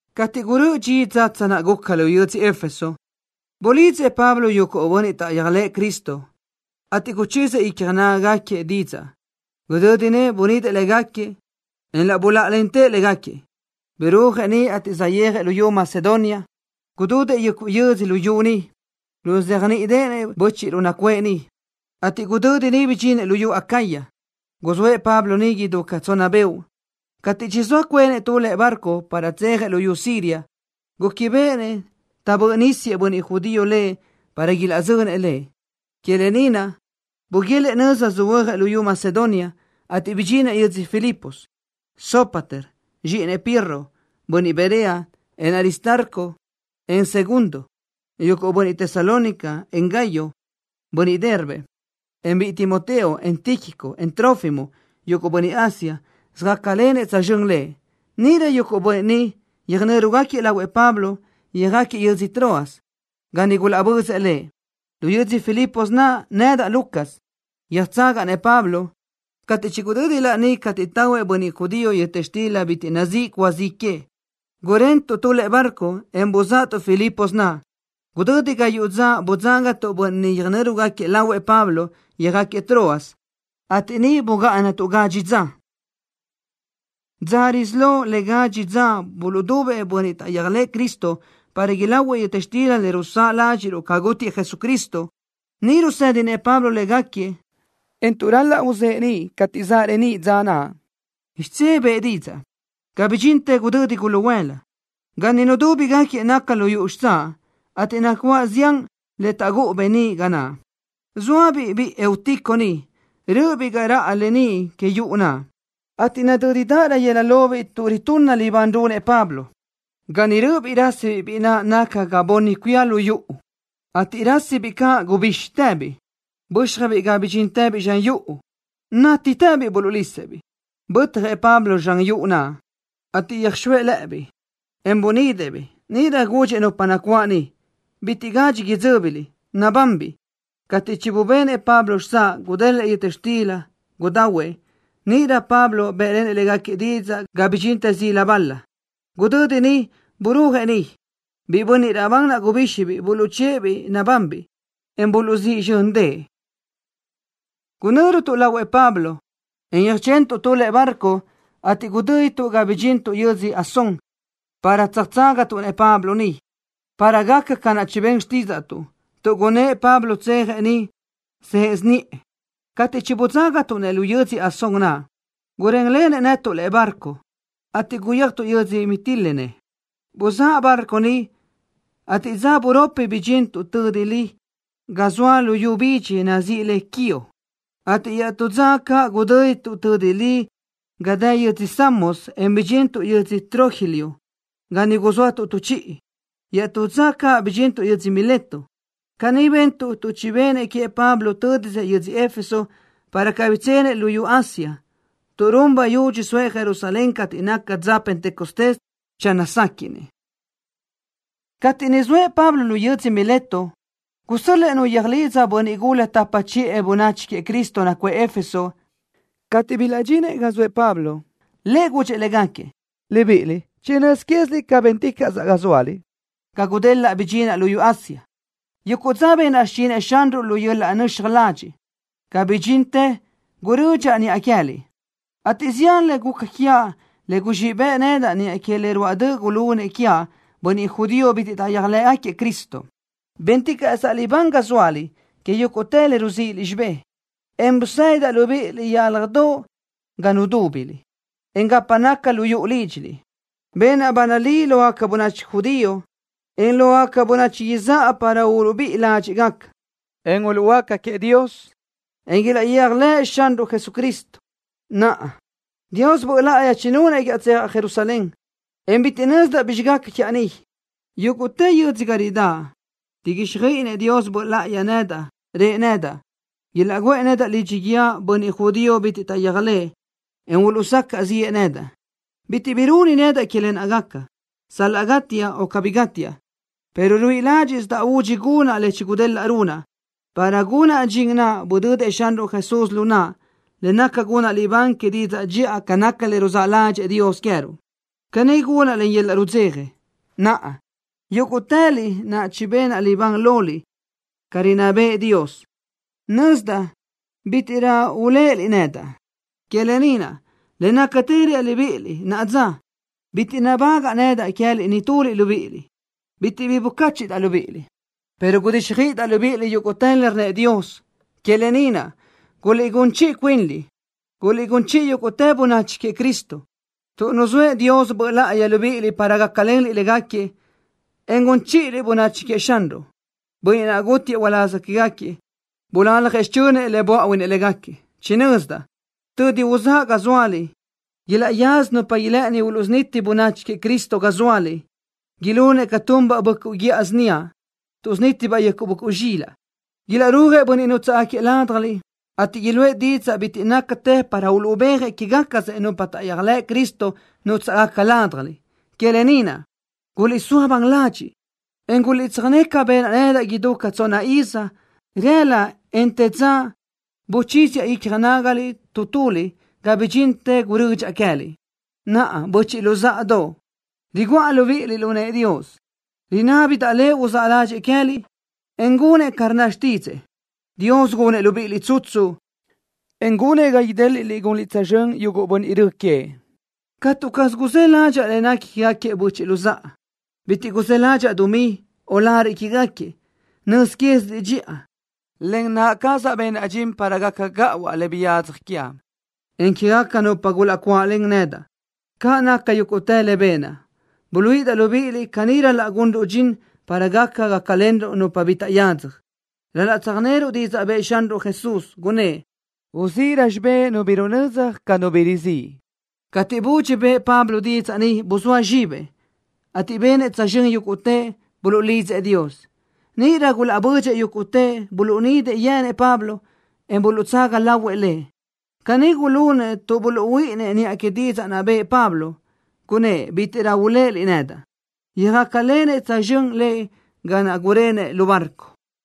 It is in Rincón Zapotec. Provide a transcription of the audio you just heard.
Cateʼ gurö́ʼö dxi dzatsa naʼ guca lu yödzö Éfeso, bulidzëʼ Pablo yuguʼ bönniʼ taʼyéajlëʼë Cristo, ateʼ guchíziëʼ icja nágagaquiëʼ didzaʼ. Gudödi niʼ bunidëʼ légaquiëʼ, en laʼ buláʼalentëʼ légaquiëʼ. Birúajëʼ niʼ, ateʼ saʼyéajëʼ luyú Macedonia. Gudödëʼ yuguʼ yödzö luyú niʼ, ruzéajniʼideʼenëʼ bö́chiʼruʼ nacuʼë niʼ, ateʼ gudödi niʼ bidxinëʼ luyú Acaya. Guzóëʼ Pablo niʼ idú ca tsonna beoʼ. Cateʼ chizóa cuenëʼ tu lëʼe barco para tsejëʼ luyú Siria, gúquibeʼenëʼ taʼbö́ʼ nísiëʼ bönniʼ judío lëʼ para ilaʼzönëʼ lëʼ. Que lë ni naʼ buguélëʼë nöza söhuö́jëʼ luyú Macedonia, ateʼ bidxinëʼ yödzö Filipos. Sópater, zxíʼinëʼ Pirro, bönniʼ Berea, en Aristarco, en Segundo, yuguʼ bönniʼ Tesalónica, en Gayo, bönniʼ Derbe, encaʼ biʼi Timoteo, en Tíquico, en Trófimo, yuguʼ bönniʼ Asia, söjácalenëʼ tsözxö́n lëʼ. Níʼirö yuguʼ bönniʼ ni yöjnö́rugaquiëʼ lahuëʼ Pablo, yöjáquiëʼ yödzö Troas, ga niʼ gulaʼbözëʼ lëʼ. Lu yödzö Filipos naʼ, nedaʼ, Lucas, yöjtsagaʼ-nëʼ Pablo. Cateʼ chigudödi laní cateʼ tahuëʼ bönniʼ judío yöta xtila bitiʼ nazíʼi cúa zi que, gurentuʼ tu lëʼe barco, en buzáʼatuʼ Filipos naʼ. Gudödi gayuʼ dza budzágatuʼ bönniʼ niʼ yöjnö́rugaquiëʼ lahuëʼ Pablo, yöjáquiëʼ Troas, ateʼ niʼ bugáʼanatuʼ gadxi dza. Dza risí lo le gadxi dza buluʼdubëʼ bönniʼ taʼyéajlëʼë Cristo para ilahuëʼ yöta xtila le rusáʼ ládxiʼruʼ ca gútiëʼ Jesucristo. Niʼ rusë́dinëʼ Pablo légaquiëʼ, en tuʼ ral-laʼ uzë́ʼë niʼ cateʼ zaʼ reníʼ dza naʼ, xidzé bëʼë didzaʼ, ga bidxintë gudödi guluhuëla. Ga niʼ nudúbigaquiëʼ naca lu yuʼu xitsáʼ, ateʼ nacuáʼ zián le taʼgúʼu beníʼ ga naʼ. Zóabiʼ biʼi Eutico niʼ, rö́ʼöbiʼ ga raʼa leníʼ que yuʼu naʼ, ateʼ nadö́dirö yëla lobiʼ tuʼ ritunna libán runëʼ Pablo. Ga niʼ rö́ʼöbiʼ rásibiʼ biʼi naʼ naca ga bunni cuía lu yuʼu, ateʼ rásisibiʼ caʼ gubíxitëbiʼ, bö́xjabiʼ ga bidxíntëbiʼ zxan yuʼu. Nátitëbiʼ buluʼlisëʼ-biʼ. Bötjëʼ Pablo zxan yuʼu naʼ, ateʼ yöjxóëʼ lëbiʼ, en bunidëʼ-biʼ. Níʼirö gudxëʼ nupa nacuáʼ niʼ: —Bitiʼ gadxi idzö́biliʼ. Nabanbiʼ. Cateʼ chibubenëʼ Pablo xitsáʼ, gudélëʼë yöta xtila, gudahuëʼ. Níʼirö Pablo bë́ʼlenëʼ légaquiëʼ didzaʼ ga bidxintë zila balö. Gudödi niʼ burúajëʼ niʼ. Biʼi bönniʼ raʼbán naʼ gubíxibiʼ, buluʼchë́ʼë-biʼ nabanbiʼ, en buluʼzíʼ zxö́ndëʼë. Gunö́rutuʼ lahuëʼ Pablo, en yöjchentuʼ tu lëʼe barco, ateʼ gudö́dituʼ ga bidxintuʼ yödzö Asón para tsöjtságatuʼ-nëʼ Pablo niʼ, para gaca ca naʼ chibén xtídzaʼtuʼ, tuʼ gúʼunnëʼ Pablo tsejëʼ niʼ së́ʼesi niʼë. Cateʼ chibudzágatuʼ-nëʼ lu yödzö Asón naʼ, gurénlenëʼ netuʼ lëʼe barco, ateʼ guyéajtuʼ yödzö Mitilene. Buzáʼ barco niʼ, ateʼ dza buropi bidxintuʼ tödi li ga zoa luyú bidxi nazíʼi le Quío, ateʼ iaʼtú dza caʼ gudö́dituʼ tödi li ga dë yödzö Samos, en bidxintuʼ yödzö Trogilio ga niʼ guzóatuʼ tu chiʼi. Iaʼtú dza caʼ bidxintuʼ yödzö Mileto. Caní bentuʼ tuʼ chibenëʼ queëʼ Pablo tö́disëʼ yödzö Éfeso, para cabí tsenëʼ luyú Asia, tuʼ run bayudxi soëʼ Jerusalén cateʼ naca dza Pentecostés channö séquiʼnëʼ. Cateʼ niʼ zoëʼ Pablo lu yödzö Mileto, gusö́l-lëʼë nu yöjlidza bönniʼ gula tapa chiʼë bönachi queëʼ Cristo nacuʼë Éfeso. Cateʼ bilaʼdxinëʼ ga zoëʼ Pablo, lëʼ gudxëʼ légaquiëʼ: —Libíʼiliʼ chinö́z quéziliʼ ca bénticaʼsaʼ ga zóaliʼ ga gudelaʼ bidxinaʼ luyú Asia. Yuguʼ dza benaʼ xichinëʼ Xanruʼ lu yöl-laʼ nöxaj ladxiʼ, ga bidxintë gurödxaʼ niʼa queë́liʼ, ateʼ zián le guca quiaʼ le guzxíʼ bëʼ nedaʼ niʼa que le ruáʼ döʼ gulunëʼ quiaʼ bönachi judío bitiʼ taʼyéajlëʼ Cristo. Bénticaʼsaʼ libán ga zóaliʼ que yúguʼtë le ruzíʼiliʼ xibé, en busédidaʼ libíʼiliʼ yálajdoʼ ga nudúbiliʼ, en gapa naca lu yuʼu lídxiliʼ. Benaʼ ba nalí lógaca bönachi judío, en lógaca bönachi izáʼa para uluʼbíʼi ládxiʼgaca, en uluʼhuöáca queëʼ Dios, en ilaʼyéajlëʼ Xanruʼ Jesucristo. Naʼa, Dios Böʼ Láʼayi chinunëʼ quiaʼ tsejaʼ Jerusalén, en bitiʼ nözdaʼ bizxi gaca quiaʼ niʼ. Yúguʼtë yödzö ga ridáʼ, riguíxjöiʼinëʼ Dios Böʼ Láʼayi nedaʼ, rëʼ nedaʼ ilaʼguʼë nedaʼ lidxi guíë bönniʼ judío bitiʼ taʼyéajlëʼ, en uluʼsacaʼ ziʼë nedaʼ. Bitiʼ bi runi nedaʼ que lë naʼ gaca, sal-laʼ gátiaʼ o cabí gátiaʼ, pero ruíʼi ládxiʼsidaʼ údxi gunaʼ le chigudélaʼa runaʼ, para gunaʼ dxin naʼ budödëʼ Xanruʼ Jesús lu naʼa, le naca gunaʼ libán que didzaʼ dxiʼa ca naca le ruzáʼ ládxëʼë Dios queë́ruʼ. Caní gunaʼ len yöl-laʼ rudzeja. ’Naʼa, yúguʼtëliʼ naʼ chibenaʼ libán loliʼ ca rinná bëʼë Dios, nözdaʼ bítiʼrö uléʼeliʼ nedaʼ. Que lë ni naʼ, le nácatë reaʼ libíʼiliʼ naʼa dza. Bitiʼ nabágaʼa nedaʼ queë́liʼ nituliʼ libíʼiliʼ. Bitiʼ bi bucáchiʼdaʼ libíʼiliʼ, pero gudíxjöiʼidaʼ libíʼiliʼ yúguʼtë le rnnëʼ Dios. Que lë ni naʼ, guliʼgún chiʼi cuinliʼ, en guliʼgún chiʼi yúguʼtë bönachi queëʼ Cristo, tuʼ nuzóëʼ Dios Böʼ Láʼayi libíʼiliʼ para gácalenliʼ légaquiëʼ, en gun chíʼiliʼ bönachi queëʼ Xanruʼ, Bönniʼ naʼ gútiëʼ uláz quégaquiëʼ, bulaljëʼ xichönëʼ le böáʼuinëʼ légaquiëʼ. Chinözdaʼ, tödi uzáʼa ga zóaliʼ, ilaʼyaza nupa ilë́ʼëni uluʼsuniti bönachi queëʼ Cristo ga zóaliʼ, ilunëʼ ca tunbaʼ böʼcuʼ guíʼa síniaʼ, tuʼsunítibaʼ yuguʼ böʼcuʼ zxilaʼ. Ilaʼrúajëʼ bönniʼ nútsaʼgaquiëʼ ládjaliʼ, ateʼ iluʼë didzaʼ bitiʼ nácatë para uluʼbéajëʼ quégacasëʼ nupa taʼyéajlëʼ Cristo nútsaʼgaca ládjaliʼ. Que lë ni naʼ, guliʼsóa ban ladxiʼ, en guliʼtsöjné ca benaʼ nedaʼ idú ca tsonna iz, rëla, en të dza buchíziaʼ icja nágaliʼ tu tuliʼ ga bidxintë gurödxaʼ queë́liʼ. ’Naʼa, böchiʼ luzáʼadoʼ, riguʼa libíʼiliʼ lu nëʼë Dios. Rinábidaʼ Lëʼ uzáʼ ládxëʼë queë́liʼ, en gunëʼ ca rnna xtídzëʼë. Dios gunëʼ libíʼiliʼ tsutsu, en gunëʼ ga idéliʼliʼ gunliʼ tsözxö́n yuguʼ bönniʼ rö queëʼ. Catu caz guzë́ ládxaʼa le nequi quégaquiëʼ böchiʼ luzáʼa. Bitiʼ guzë́ ládxaʼa dumí, o lariʼ quégaquiëʼ. Nöz quéziliʼ dxiʼa, len naʼa cazaʼ benaʼ dxin para gaca gáʼuaʼ le biyadzaj quiaʼ, en quégaca nupa gulaʼcuáʼlen nedaʼ. Ca naca yúguʼtë le benaʼ, buluíʼidaʼ libíʼiliʼ caní ral-laʼ gunruʼ dxin para gaca gácalenruʼ nupa bi taʼyadzaj. Ral-laʼ tsöjneruʼ didzaʼ bëʼë Xanruʼ Jesús, gunnë́ʼ: “Uzíʼirö xibé nu bi runödzaj ca nu bi rizíʼ.” Cateʼ budxi bëʼë Pablo didzaʼ ni, buzóa zxibëʼ, ateʼ benëʼ tsözxö́n yúguʼtëʼ, buluʼlidzëʼ Dios. Níʼirö gulaʼbödxëʼ yúguʼtëʼ. Buluʼnidëʼ yenëʼ Pablo, en buluʼtsaga lahuëʼ lëʼ. Caní gulunëʼ tuʼ buluʼhuíʼinnëʼ niʼa que didzaʼ naʼ bëʼë Pablo, gunnë́ʼ: “Bítiʼrö uléʼeliʼ nedaʼ.” Yöjácalenëʼ tsözxö́n lëʼ ga naʼ gurenëʼ lu barco.